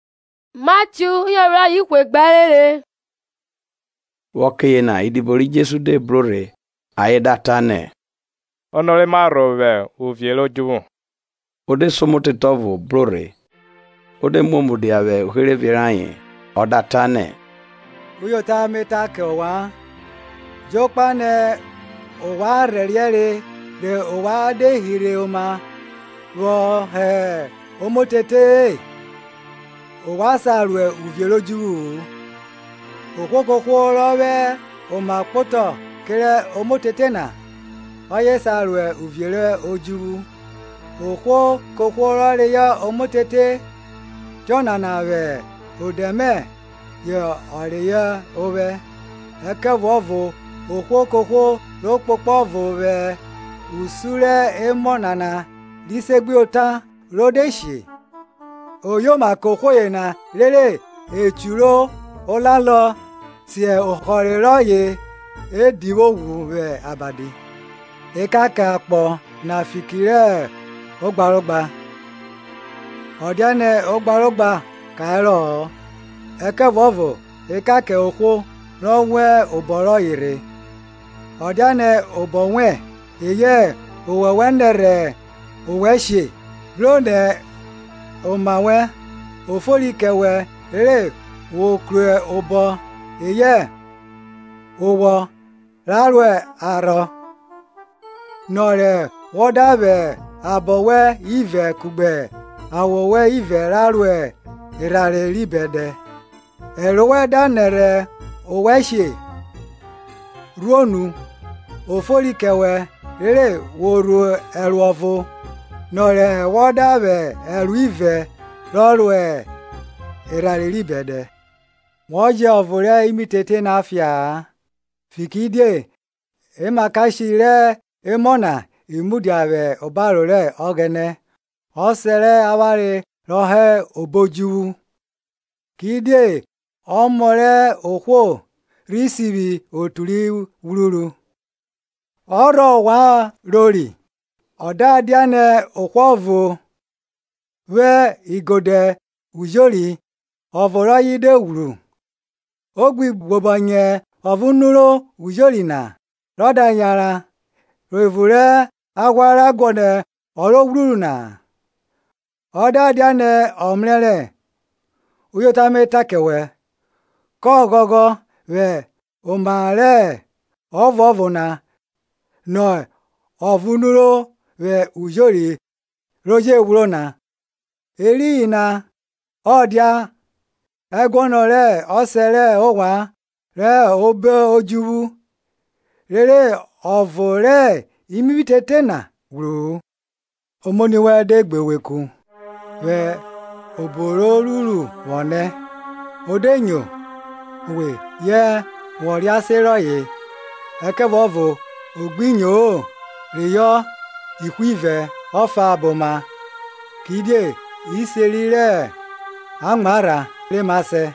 Ono ro Ma Rho? Vwẹ ọke yena idibo ri Jesu de bro rhe ayen da nọ nẹ, Ono re ma rho vwẹ uvie rẹ odjuvwu? O de se omotete ọvo bro rhe, o de muo mudia vwẹ uherevie rayen, ọ da ta nẹ, Uyota me ta kẹ ovwan, Jokpa nẹ ovwan rhẹriẹ re rẹ ovwan de hirhe oma vwọ hẹ omotete-e, ovwan sa ro uvie rẹ odjuvwu-u. Ohwo kohwo rọ vwẹ oma kpotọ kerẹ omotete na, ọye re sa ro uvie rẹ odjuvwu. Ohwo kohwo rọ reyọ omotete tiọnana vwẹ odẹ mẹ yọ reyọ ovwẹ. Ẹkẹvuọvo ohwo kohwo ro kpokpo ọvo vwẹ usun rẹ emọ nana ri segbuyota na ro de she, oyoma kẹ ohwo yena rere o churu olalọ si ohọre re o divwi ghwu vwẹ abadi. Ekan kẹ akpọ na fiki rẹ ogbarogba! o dianẹ ogbarogba karọ-ọ, ẹkẹvuọvo ekan kẹ ohwo rọ wan obọ rọye rhe. Ọ diane obọ wẹn, eyẹ owọ wẹ nẹrhẹ owẹ she, bro nẹ oma wẹn o fori kẹ wẹ rere wo vwo kru obọ eyẹ owọ ra ro arhọ, nọ re wọ da vwẹ abọ wẹn ivẹ kugbe awọ wẹn ivẹ ra ro erhanre ri bẹdẹ. Ẹro wẹn da nẹrhẹ owẹ she, rhuo nu; o fori kẹ wẹ rere wo rhu ẹro ọvo, nọ re wọ da vwẹ ẹro ivẹ ro erhanre ri bẹdẹ. Wo jẹ ọvo rẹ imitete na fia-a, fikiridie emakashe rẹ emọ na i mudia vwẹ obaro rẹ Ọghẹnẹ Ọsẹ rẹ avwanre rọ hẹ obo odjuvwu. Kidie Ọmọ rẹ ohwo rhi sivwi otu ri ghwruru. Ọrhọ ovwan rori? ọ da dianẹ ohwo vwo igodẹ ujori, ọvo rọye de ghwru, o gbi gbobọnyẹ ọvo nuro ujori na, rọ da yan ro evun rẹ aghwa ra guọnọ ọ ro ghwruru na? Ọ da dianẹ ọ mrẹrẹ, Uyota me ta kẹ wẹ, kọ ghọghọ vwẹ oma rẹ ọvuọvo na nọ ọvo nuro vwẹ ujori ri je ghwro na. Eriyin na ọ dia ẹguọnọ rẹ Ọsẹ rẹ ovwan rọ hẹ obo odjuvwu rere ọvo rẹ imitete na vwo ghwru-u. Omoni wẹn de gbe we ku, vwẹ obo ro ruru vwọ nẹ; o de nyo we ye wọ rease rọye. Ẹkẹvuọvo o gbi nyo-o, reyọ ihwo ivẹ efa boma, kidie iseri rẹ amwarha re ma sẹ.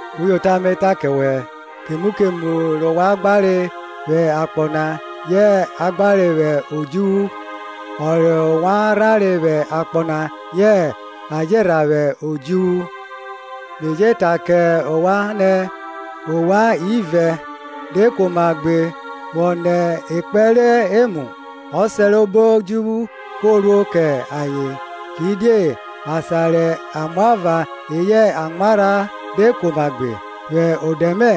Uyota me ta kẹ wẹ, kemu kemu rẹ ovwan gbare vwẹ akpọ na yẹ a gbarọ vwẹ odjuvwu. Ọ rẹ ovwan rhanre vwẹ akpọ na yẹ a je rhan vwẹ odjuvwu. Me je ta kẹ ovwan nẹ, ovwan ivẹ de kuoma gbe vwọ nọ ekpẹn rẹ emu, Ọsẹ rẹ obo odjuvwu kọ ruo kẹ ayen. Kidie asan rẹ amwava eyẹ amwarha de kuoma gbe vwẹ odẹ mẹ,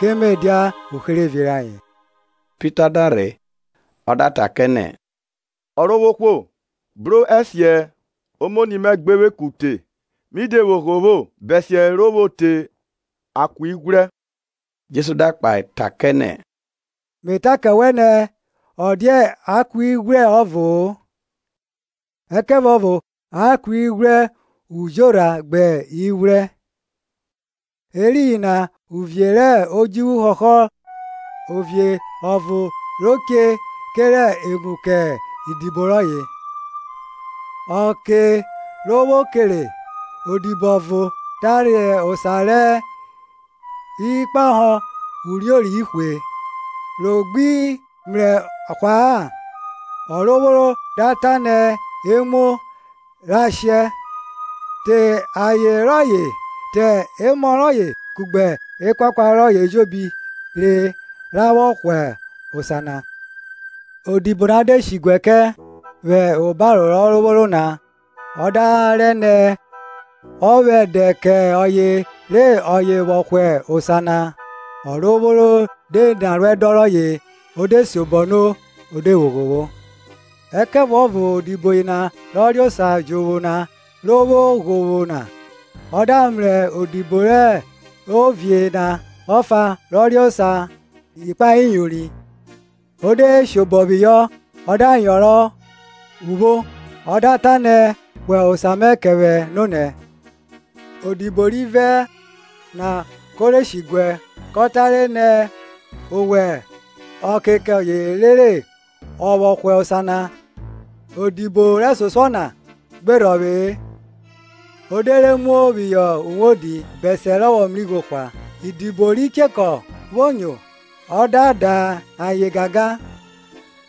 ke me dia uherevie rayen. Pita da rhe, o da ta kẹ nẹ, Ọrovwohwo bro ẹsiẹ omoni mẹ gbe vwe ku te, mi de vwo ghovwo, bẹsiẹ ro vwo te akueghwrẹ? Jesu da kpahe kẹ nẹ, Me ta kẹ we nẹ, ọ dia akueghwrẹ ọvo-o, ẹkẹvuọvo akueghwrẹ ujorha gbẹ ighwrẹ. Eriyin na uvie rẹ odjuvwu họhọ ovie ọvo ro che kere emu kẹ idibo rọye. Ọke ro vwo kere, odibo ọvo da re osa rẹ ikpahọ uriori ihwe. Rọ gbe mrẹ hwa-a, ọrovworo da ta nẹ, e muo ra shẹ, te aye rọye, te emọ rọye kugbe ekuakua rọye ejobi re ọ vwọ hwa osa na. Odibo na de she diguẹ vwẹ obaro rẹ ọrovworo na, ọ da rẹ nẹ, ọ vwẹ ẹdẹ kẹ ọye re ọye vwọ hwa osa na. Ọrovworo de ni aruẹdọn rọye, o de siobọ no o de vwo ghovwo. Ẹkẹvuọvo odibo yena rọ re osa jovwo na re vwo ghovwo na, ọ da mrẹ odibo rẹ ovie na ọfa ro re osa ikpahọ iyori. O de shabọ phihọ, ọ da yọnrọn upho, ọ da ta nẹ, Hwa osa mẹ kẹ vwẹ. Odibo rivẹ na ko rhe shiguẹ, ko rẹ nẹ ọ vwẹ ọke kẹ ọye rere ọ vwọ hwa osa na. Odibo rẹsosuọ na gbe rhọvwe-e, o de re muo phihọ uwodi, bẹsiẹ rọ vwọ mrẹ igho na hwa. Idido ri chekọ vwo nyo, ọ da da ayen gangan,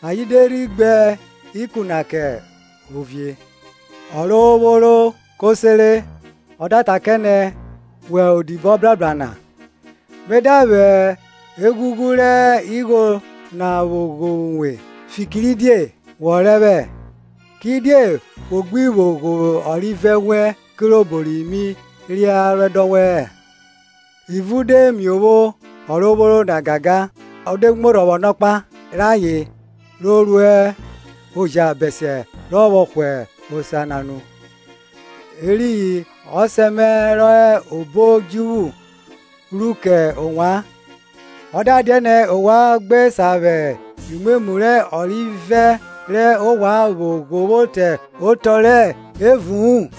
ayen de rhi gbe ikun na kẹ onini rayen. Ọrovworo ko sere, ọ da ta kẹ nẹ, Wẹ odibo obrabra na, me da vwẹ eghughu rẹ igho na vwo ghovwo uwe, fikiridie wọ rẹ vwẹ. Kidie wo gbi vwo ghovwo ọrivẹ wẹn kirobo mi ni aruẹdọn wẹ-ẹ? Ivun de miovwo ọrovworo na gangan, o de muo vwo rhe ọnọkpa re ayen ruo oja bẹsiẹ rọ vwọ hwa osa na nu. Eriyin Ọsẹ mẹ ro hẹ obo odjuvwu ru kẹ ovwan, ọ da dianẹ ovwan gbe sa vwẹ imwemwu rẹ orivẹ rẹ ovwan vwo ghovwo te otọ rẹ evu-un.